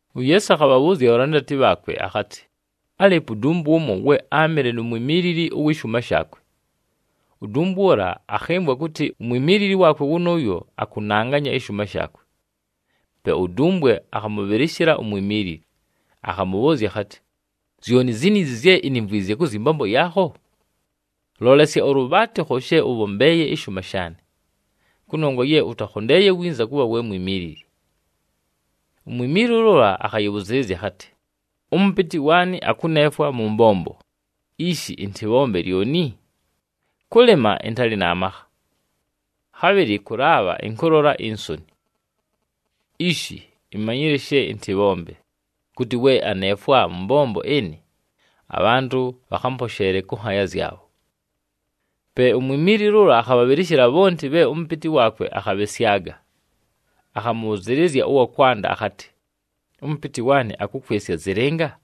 UYeesu akhabhabhʉʉzya abhalandati bhaakwe akhatɨ, “Álɨɨpo udumbwe ʉmo, we áamɨle nu mwimiilili ʉwɨ shʉʉma shaakwe. Udumbwe ʉla akhɨmvwa kʉtɨ umwimiilili waakwe wʉnʉʉyo akʉnanganya ɨshʉʉma shaakwe. Pe udumbwe akhamʉbhɨlɨshɨla umwimiilili, akhamʉbhʉʉzya akhatɨ, ‘Zyoni ziniizi zye inimvwizye kʉ zyɨ mbombo yaakho? Lolesya ʉlʉbhaatɨkho she ʉbhombeeye ɨshʉʉma shaanɨ, kʉnongwa ye ʉtakhondeeye winza kʉbha we mwimiilili!’ “Umwimiilili ʉla akhayɨbhʉzɨɨlɨzya akhatɨ, ‘Ʉmʉpɨtɨ waanɨ akʉneefwa mʉ mbombo, ishi ɨntɨbhombe lyoni? Kʉlɨma, ɨntalɨ na makha. Khabhɨlɨ kʉlaabha, ɨnkʉlola insoni. Ishi, imanyile she ɨntɨbhombe, kʉtɨ we aneefwa mʉ mbombo ɨnɨ, abhantʉ bhakhamposheele kʉ nhaaya zyabho.’ “Pe umwimiilili ʉla akhabhabhɨlɨshɨla bhonti bhe ʉmʉpɨtɨ waakwe akhabhɨsyaga. Akhamʉbhʉzɨɨlɨzya ʉwa kwanda akhatɨ, ‘Ʉmʉpɨtɨ waanɨ akʉkwɨsya zɨlɨnga?’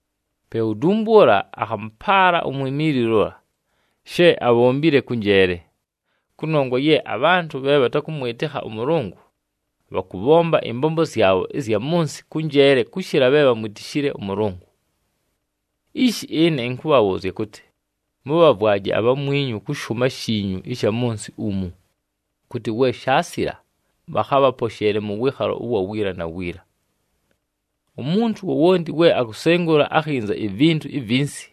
“Pe udumbwe ʉla akhamʉpaala umwimiilili ʉla, she abhombile kʉ njeele. Kʉnongwa ye abhantʉ bhe bhatakʉmwɨtɨkha ʉMʉlʉngʉ, bhakʉbhomba ɨmbombo zyabho ɨzya mʉ nsɨ kʉ njeele kʉshɨla bhe bhamwitishile ʉMʉlʉngʉ. “Ishi ɨne ɨnkʉbhabhʉʉzya kʉtɨ, mʉbhavwaje abhamwinyu kʉ shʉʉma shiinyu ɨsha mʉ nsɨ umu, kʉtɨ we shaasila, bhakhabhaposheele mʉ wɨɨkhalo ʉwa wiila na wiila. “Umuntu wowonti we akusengula akhinza ivintu ivinsi,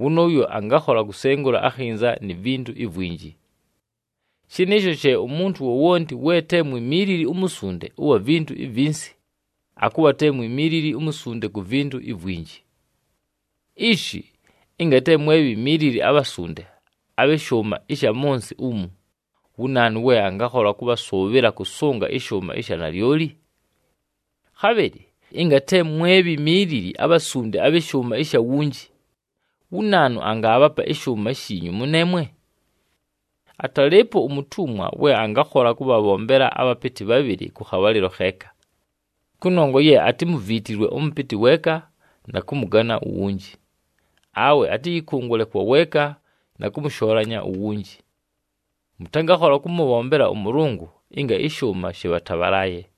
wʉnʉʉyo angakhola kusengula akhinza ni vintu ivwinji. Shɨnɨɨsho she umuntu wowonti we te mwimiilili umusunde ʉwa vintu ivinsi, akʉbha te mwimiilili umusunde ku vintu ivwinji. Ishi, ɨnga te mwe bhimiilili abhasunde abhɨ shʉʉma ɨsha mʉ nsɨ umu, wu naanu we angakhola kʉbhasʉʉbhɨla kʉsʉnga ɨshʉʉma ɨsha nalyoli! Khabhɨlɨ ɨnga te mwe bhimiilili abhasunde abhɨ shʉʉma ɨsha wunji, wu naanu angaabhapa ɨshʉʉma shiinyu mʉneemwe? Atalɨɨpo umutumwa we angakhola kʉbhabhombela abhapɨtɨ bhabhɨlɨ kʉ khabhalɨlo kheeka. Kʉnongwa ye atimuviitilwe ʉmʉpɨtɨ weeka na kʉmʉgana uwunji, awe atɨyɨkʉngʉle kwa weeka na kʉmʉshoolanya uwunji. Mʉtangakhola kʉmʉbhombela ʉMʉlʉngʉ ɨnga ɨshʉʉma shɨbhatabhalaaye!”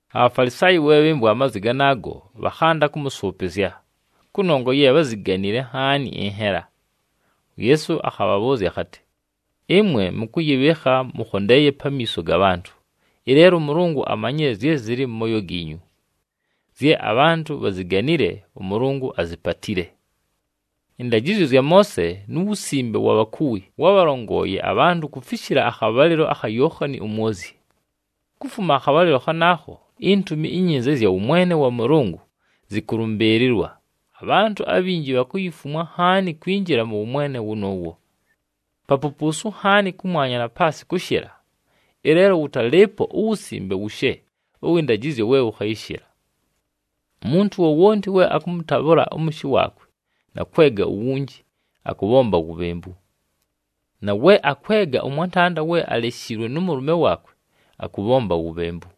ABhafalisaayi we bhɨmvwa amazwi ganaago, bhakhanda kʉmʉsʉʉpɨzya, kʉnongwa ye bháziganile nhaani ɨnhela. UYeesu akhabhabhʉʉzya akhatɨ, “Ɨmwe mʉkʉyɨbhɨɨkha mʉkhondeeye pamiiso ga bhantʉ, ɨleelo ʉMʉlʉngʉ amanyile zye zɨlɨ mʉ mooyo giinyu. Zye abhantʉ bhaziganile, ʉMʉlʉngʉ azipatile! “Ɨndajɨzyo zya Moose nu wusimbe wa bhakuwi wábhalongooye abhantʉ kufishila akhabhalɨlo akha Yookhani uMwozyi. Kufuma akhabhalɨlo khanaakho, iNtumi iNyinza ɨzya wʉmwene wa Mʉlʉngʉ zɨkʉlʉmbɨɨlɨlwa, abhantʉ abhinji bhakuyifumwa nhaani kwinjila mʉ wʉmwene wʉnʉʉwo. Papupuusu nhaani kʉmwanya na paasɨ kʉshɨla, ɨleelo wʉtalɨɨpo uwusimbe wushe ʉwɨ ndajɨzyo we wʉkhayɨshɨla. “Umuntu wowonti we akʉmʉtabhʉla ʉmʉshɨ waakwe na kwega uwunji, akʉbhomba wubhembu. Na we akwega ʉmwantanda we aleshiilwe nʉ mʉlʉme waakwe, akʉbhomba wubhembu.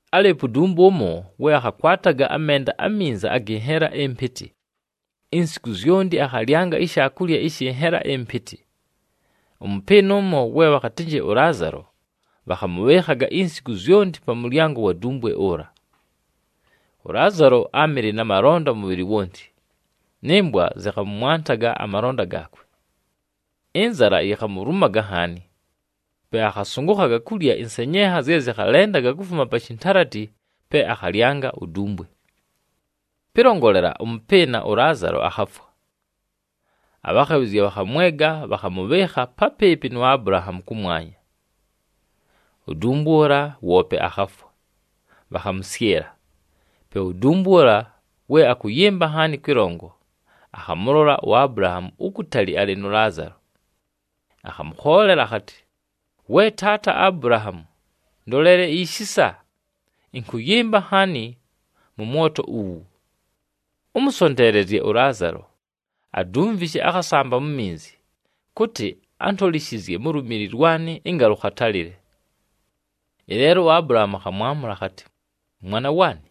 “Álɨɨpo udumbwe ʉmo, we akhakwataga amenda aminza agɨ nhela ɨmpɨtɨ. Insiku zyonti akhalyanga ishaakulya ɨshɨ nhela ɨmpɨtɨ. Ʉmʉpɨɨna ʉmo, we bhakhatɨnjɨ ʉLaazalo, bhakhamʉbhɨɨkhaga insiku zyonti pa mʉlyango wa dumbwe ʉla. ɄLaazalo áamɨle na malonda ʉmʉbhɨlɨ wonti, nɨ mbwa zɨkhamʉmwantaga amalonda gaakwe. Ɨnzala yikhamulumaga nhaani, pe akhasʉngʉkhaga kulya ɨnsenyenha zye zɨkhalendaga kufuma pa shintalati pe akhalyanga udumbwe. “Pɨlongolela, ʉmʉpɨɨna ʉLaazalo akhafwa. Abhakhabhɨzya bhakhamwega, bhakhamʉbhɨɨkha papɨɨpɨ nu Abulahaamu kʉmwanya. Udumbwe ʉla, woope akhafwa, bhakhamʉsyɨla. Pe udumbwe ʉla we akʉyɨmba nhaani kwɨlongo, akhamʉlola uAbulahaamu ukutali alɨ nʉ Laazalo. Akhamʉkhoolela akhatɨ, ‘We taata Abulahaamu, ndolele ishisa! Ɨnkʉyɨmba nhaani mʉ mwoto uwu! Ʉmʉsonteelezye ʉLaazalo, adumvishe akhasamba mu minzi, kʉtɨ antolishizye mu lumili lwanɨ ɨnga lʉkhatalɨle.’ “Ɨleelo uAbulahaamu akhamwamʉla akhatɨ, ‘Mwana waanɨ,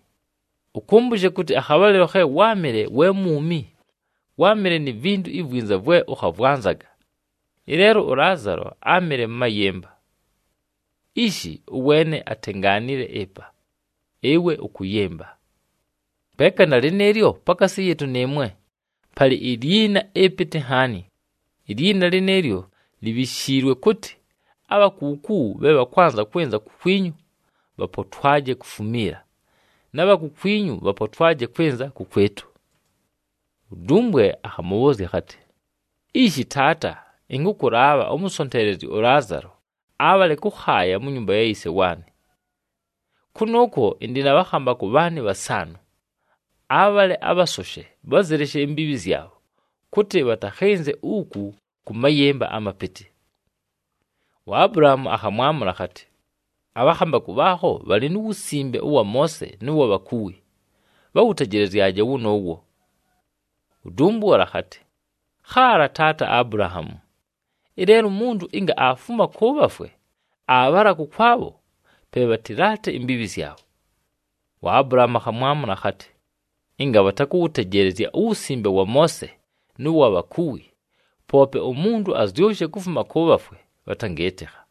ʉkʉmbʉshe kʉtɨ akhabhalɨlo khe wáamɨle we mwumi, wáamɨle ni vintu ivwinza vwe ʉkhavwanzaga, ɨleelo ʉLaazalo áamɨle mʉ mayɨmba. Ishi, ʉweene atengaanile ɨpa, ɨwe ʉkʉyɨmba. Peeka na lɨnɨɨlyo, pakaasi yɨɨtʉ nɨɨmwe, palɨ ilyina ɨpɨtɨ nhaani. Ilyina lɨnɨɨlyo libhishiilwe kʉtɨ, abha kuuku bhe bhakwanza kwɨnza kukwinyu, bhapotwaje kufumiila, na bha kukwinyu bhapotwaje kwɨnza kʉkwɨtʉ.’ “Udumbwe akhamʉbhʉʉzya akhatɨ, ‘Ishi taata, ɨnkʉkʉlaabha ʉmʉsonteelezye ʉLaazalo abhale kʉkhaaya mu nyumba ya yise waanɨ. Kʉnʉʉkwo ɨndɨ na bhakhambakʉ bhaanɨ bhasaanʉ. Abhale abhasoshe bhazɨleshe imbiibhi zyabho, kʉtɨ bhatakhɨnze uku kʉ mayɨmba amapɨtɨ.’ UAbulahaamu akhamwamʉla akhatɨ, ‘Abhakhambakʉ bhaakho bhalɨ nu wusimbe ʉwa Moose nʉ wa bhakuwi, bhawʉtejelezyaje wʉnʉʉwo!’ “Udumbwe ʉla akhatɨ, ‘Khaala, taata Abulahaamu! Ɨleelo umuntu ɨnga aafuma kʉ bhafwe aabhala kʉkwabho, pe bhatɨlaate imbiibhi zyabho.’ UAbulahaamu akhamwamʉla akhatɨ, ‘Ɨnga bhatakʉwʉtejeelezya uwusimbe wa Moose nʉ wa bhakuwi, poope umuntu azyʉshe kufuma kʉ bhafwe, bhatangɨɨtɨkha.’”